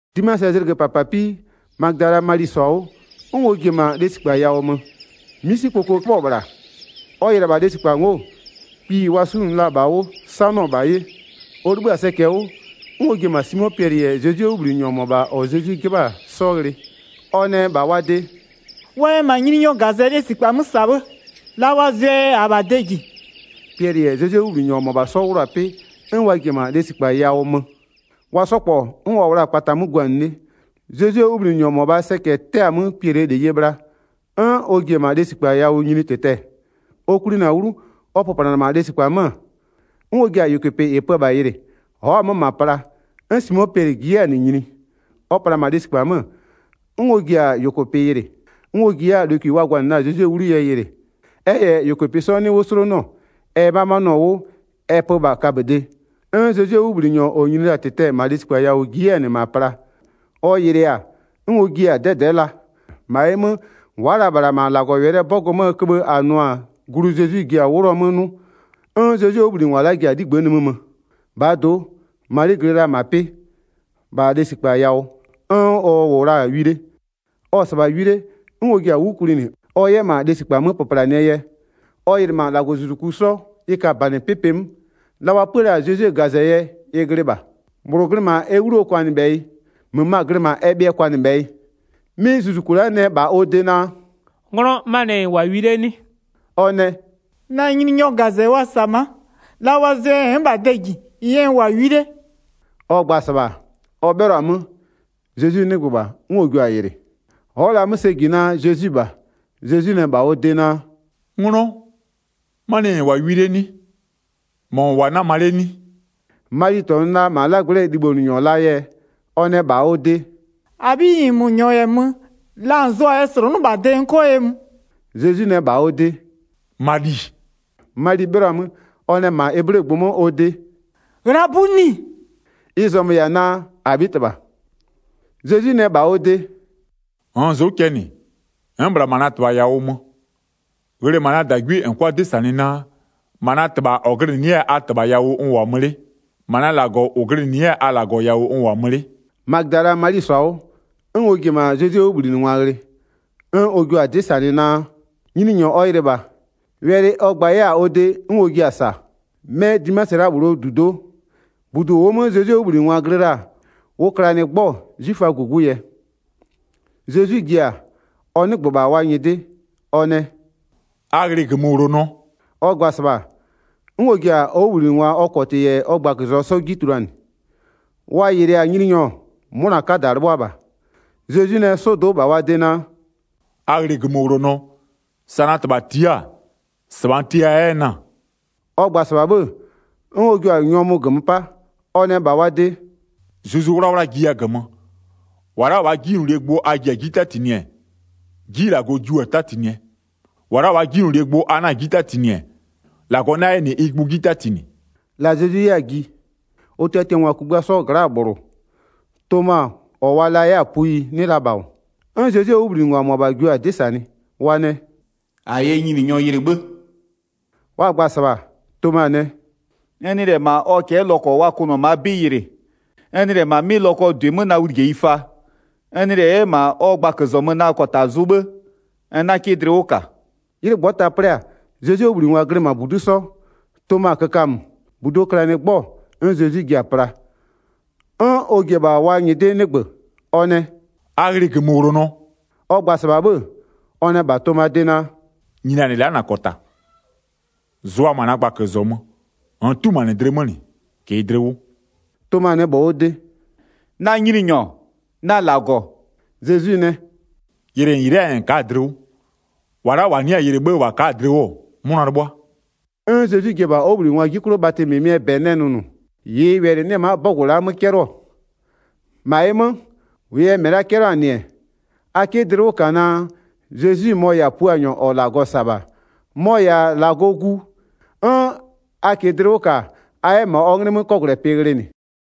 'Dimasɩɛ zlɩgö -papapii, Magödalaa Mali -sɔ-a 'wʋ, 'n ɔ ji-e -ma lesikpa yawʋ mö. 'Misikpoko 'köbhɔ-ɔ -bhla, ɔ yɩlɩ-ɛ -bha lesikpa ngo'o, kpiyi wa 'sunʋ la-a -bha 'wʋ 'sanɩɔ -bha 'ye. Ɔ 'libhï-a sɛcɛ 'wʋ, 'n ɔ ji-e -ma Simo Piɛlɩ -yɛ Zezwie 'wʋbhlinɩnyɔ -mɔbha -ɔ Zezwi 'jɩbha-a 'sɔ ghlɩ. Ɔ nɛ -bha wa de: “Wa yɛ -ma lesikpa 'mö Nyininyɔɔ -gazɛ -sa 'bhë, la wa zʋɛ yɛ -aa -bha de -ji.” Piɛlɩ -yɛ Zezwie 'wʋbhlinɩnyɔ -mɔbha 'sɔ 'wlʋ-a 'pɩ 'n wa ji-e -ma lesikpa yawʋ mö. Wa 'sɔ -kpɔ 'n wa -wʋ la-a kpata 'mö guanɩ 'le, Zezwie 'wʋbhlinɩnyɔ -mɔbhaa sɛcɛ 'tɛ-a 'mö Piɛlɩɛ -leyie bhla, 'n ɔ ji-e -ma lesikpa yawʋ nyini -tɩtɛ-ɛ. Ɔ kwlinɩ-a 'wlu, ɔ pöplanɩ-ɛ -ma lesikpa 'mö, 'n ɔ ji-a -yʋkʋpɩ -ɩ pö-ö -bha yɩlɩ. Ɔ'ɔ-a 'mö -ma pla. 'N Simo Piɛlɩ ji 'yɛ-a -nɩ nyini. Ɔ pla-a -ma lesikpa 'mö, 'n ɔ ji-a -yʋkʋpɩ yɩlɩ. 'N ɔ ji 'yɛ-a lokwi wa gwanɩ la-a Zezwie 'wlu yɛ yɩlɩ, ɛ -yɛ -yʋkʋpɩ 'sɔ 'nɩ 'wʋ 'slonʋɔ, ɛ 'mamanɩɔ-ɔ 'wʋ ɛ pö -bha kaböde. 'N Zezwie 'wʋbhlinɩnyɔ -ɔ nyini la-a -tɩtɛ-ɛ -ma lesikpa yawʋ ji 'yɛ-a -nɩ -ma pla. Ɔ yɩlɩɩ-a, 'n ɔ jiɩ-a 'dɛdɛ'ɛ la. 9-Ma ɩ 'mö wa'a la -bhla -ma -Lagɔwɛlɩɛ 'bɔgʋ 'möö köbhë -a nʋ-a glu Zezwi ji-a 'wlʋɔ 'mö 'nʋ. 'N Zezwie 'wʋbhlinɩngwa la'a ji-a 'ligbë'ë nimï mö. Zezwi yɛ ɔjɩ Magödalaa Mali 'ji tuluanɩ 11-Bhaa do'o Mali glɩ la -ma 'pɩ, -bha lesikpa yawʋ 'n ɔ -wʋ-a wi 'le. Ɔ-ɔ -sɩbha wi 'le, 'n ɔ ji-a 'wlu kwlinɩ ɔ 'yɛ -ma lesikpa 'mö pöplanɩɛ yɛ. Ɔ yɩlɩ -ma -Lagɔzuzuku 'sɔ, ɩ ka -banɩ 'pʋpʋɩ 'mö, la wa 'pua la-a Zezwie -gazɛ yɛ ɩ glɩ -bha, -bhlʋ glɩ -ma ɛ 'wluo kwanɩbhɛyɩ, -möma glɩ -ma ɛ bhɩɛ kwanɩbhɛyɩ. 'Mɩ zuzuku la'a nɛ -bha ɔ de naa: “'Nglɔ, 'manɩɛ yɛ -n -wʋ-a wi 'le 'nɩ?” Ɔ nɛ: “Na Nyininyɔɔ -gazɛ wa -sa-a ma'a, la wa zʋɛ yɛ n'n -bha de -jie yɛ n -wʋ-a wi 'le.” Ɔ gba-a -sɩbha, ɔ 'bhɩlɔ-a 'mö, Zezwi 'nɩgbö -bha 'n ɔ jio-a yɩlɩ. Ɔ'ɔ la-a 'mö sɛ -ji naa Zezwi-i -bha. Zezwi nɛ -bha ɔ de naa: “'Nglɔ, 'manɩɛ yɛ -n -wʋ-a wi 'le 'nɩ? -Mɔ -n -wʋ-a 'nama 'le 'nɩ?” Mali -tɔnʋ la -ma 'lagblɛ'ɛɛ libhonʋnyɔ laa yɛ, ɔ nɛ -bha ɔ de: “-Abhiyi, -nmö -nyɔɔ -yɛ mö-ö, la -n zʋɔ-a yɛ -slʋnʋ'ʋ -bha de n 'kɔ ye mö.” Zezwi nɛ -bha ɔ de: “Mali!” Mali 'bhɩlɔ-a 'mö, ɔ nɛ -ma eblegbʋ 'mö ɔ de: “Ghlabuni!” Ɩ zɔmö-ö -yɛ-a naa: “-Abhitɩbha!” Zezwi nɛ -bha ɔ de: “-Nn zʋ'ʋ cɛ -nɩ, n'n-n -bhla -ma na -Tɩbha yawʋ mö. Ghlɩ -ma na -dagwie -n 'kʋa 'dɩ -sanɩ naa: -Ma na -Tɩbha -ɔ glɩnɩ 'yɛ-a a -Tɩbhaa yawʋ n -wʋ-a mö 'le, -ma na -Lagɔ -ʋ glɩnɩ 'yɛ-a a -Lagɔɔ yawʋ n -wʋ-a mö 'le.” Magödalaa Mali -sɔ-a 'wʋ, 'n ɔ ji-e -ma Zezwie 'wʋbhlinɩngwa ghlɩ, 'n ɔ jua-a 'dɩ -sanɩ naa: Nyininyɔ ɔ yɩlɩ -bha, wɛlɩ ɔ gba 'yɛ-a ɔ de 'n ɔ jiɩ-a -sa. 'Mɛ Dimasɩ la'a -bhlʋɔ -dudo'o, -budu -ʋʋ 'mö Zezwie 'wʋbhlinɩngwa glɩ la-a, ʋ klanɩ 'gbɔ-ɔ 'zwiföaa -gugu yɛ. Zezwi ji-a, ɔ 'nɩgbö-ö -bha wa nyɩdɩ, ɔ nɛ: “A ghlɩ -gömöwlonɔ!” Ɔ gba-a -sɩbha, 'n ɔ ji-a ɔ 'wʋbhlinɩngwa ɔ -kɔtɩ -yɛ ɔ gbaközɔmö 'sɔ 'ji tuluanɩ. Wa yɩlɩ-a Nyininyɔ, 'mʋna 'kada 'lɩbhʋa -bha. Zezwi nɛ 'sɔdo'o -bha wa de naa: “A ghlɩ -gömöwlonɔ. Sa na -Tɩbha tia'a-a, -sɩbha n tiaya 'yɛ-ɛ na-a.” Ɔ gba-a -sɩbha 'bhë, 'n ɔ jua-a nyɔmʋ -gömö 'pa. Ɔ nɛ -bha wa de: “Zuzu 'Wlawla jiya -gömö. 23-Wa la'a -waa 'jinylolie gbʋ a ji-a 'ji 'tatinɩɛ, 'ji -Lagɔ jiʋ-a 'tatinɩɛ. -Wa la'a -waa 'jinylolie gbʋ a 'na-a 'ji 'tatinɩ-ɛ, -Lagɔ 'na 'yɛ -nɩ ɩ gbʋ 'ji 'tatinɩ.” La Zezwi 'yɛ-a ji, ɔ tiatiangwa kugbïa 'sɔɔ gla'aa -bhlʋ, Toma -ɔ wa la 'yɛ-a puyi 'nɩ la -bha -wʋ. Ɔ ji-a, 'n Zezwie 'wʋbhlinɩngwa -mʋabha jio-a 'dɩ -sanɩ, wa nɛ: “-A yɛ Nyininyɔ yɩlɩ 'bhë.” Wa gba-a -sɩbha, Toma nɛ: “N nɩ -lɛ -ma ɔ cɛ'ɛ lɔkɔ wa kʋnʋ-ɔ -maa 'bɩ yɩlɩ, n nɩ -lɛ -ma 'mɩ lɔkɔɔ -dʋɩ 'mö na wlijeyi fa, n nɩ 'yɛ -lɛ -ma ɔ gbaközɔmö na -kɔta zʋ 'bhë, n 'na 'kɩ dlɩ 'wʋ -ka.” 'Ylɩ -ngbɔta 'plɩ-a, Zezwie 'wʋbhlinɩngwa glɩ -ma -budu'u 'sɔ, Toma kökamö, -buduo klanɩ 'gbɔ-ɔ 'n Zezwi ji-a pla, 'n ɔ ji-e -bha wa nyɩdɩ 'nɩgbö, ɔ nɛ: “A ghlɩ -gömöwlonɔ.” Ɔ gba-a -sɩbha 'bhë, ɔ nɛ -bha Tomaa de naa: “Nyinianɩ la'a -na -kɔta, zʋa -ma na gbaközɔmö, -nn 'tumanɩ dlɩ 'mö -nɩ -kɩɩ dlɩ 'wʋ.” Toma nɛ -bha ɔ de: “Na Nyininyɔ, na -Lagɔ.” Zezwi nɛ: “Yɩlɩ -n -yɩlɩ'ɩ-aa yɛ -n ka'a-a dlɩ 'wʋ. -Wa la'a -wa nɩ'ɩ-a yɩlɩ 'bhë -wa ka'a-a dlɩ 'wʋ, 'mʋna 'lɩbhʋa.” 'N Zezwi ji-e -bha ɔ 'wʋbhlinɩngwaa 'ji 'klʋ bhatɩ -mɩmɩɛ -bɛ nɛ nʋnʋ, -ɩɩ wɛlɩ-ɩ 'nɩ-ɛ ma'a 'bɔgʋ la'a 'mö 'cɛlɩɔ. 31-Ma ɩ 'mö, -wʋʋ yɛ -mɩ la'a 'cɛlɩɔ-a -nɩ-ɛ, a 'kɩ dlɩ 'wʋ -ka naa, Zezwi, mɔ-ɔ -yɛ-a Puanyɔ -ɔ -Lagɔ -sa-a -bha, mɔ-ɔ -yɛ-a -Lagɔɔ Gu, 'n a -kɩɩ dlɩ 'wʋ -ka, a 'yɛ -ma ɔ 'nglɩ 'mö 'kɔgwlɛpɩ ghlɩnɩ.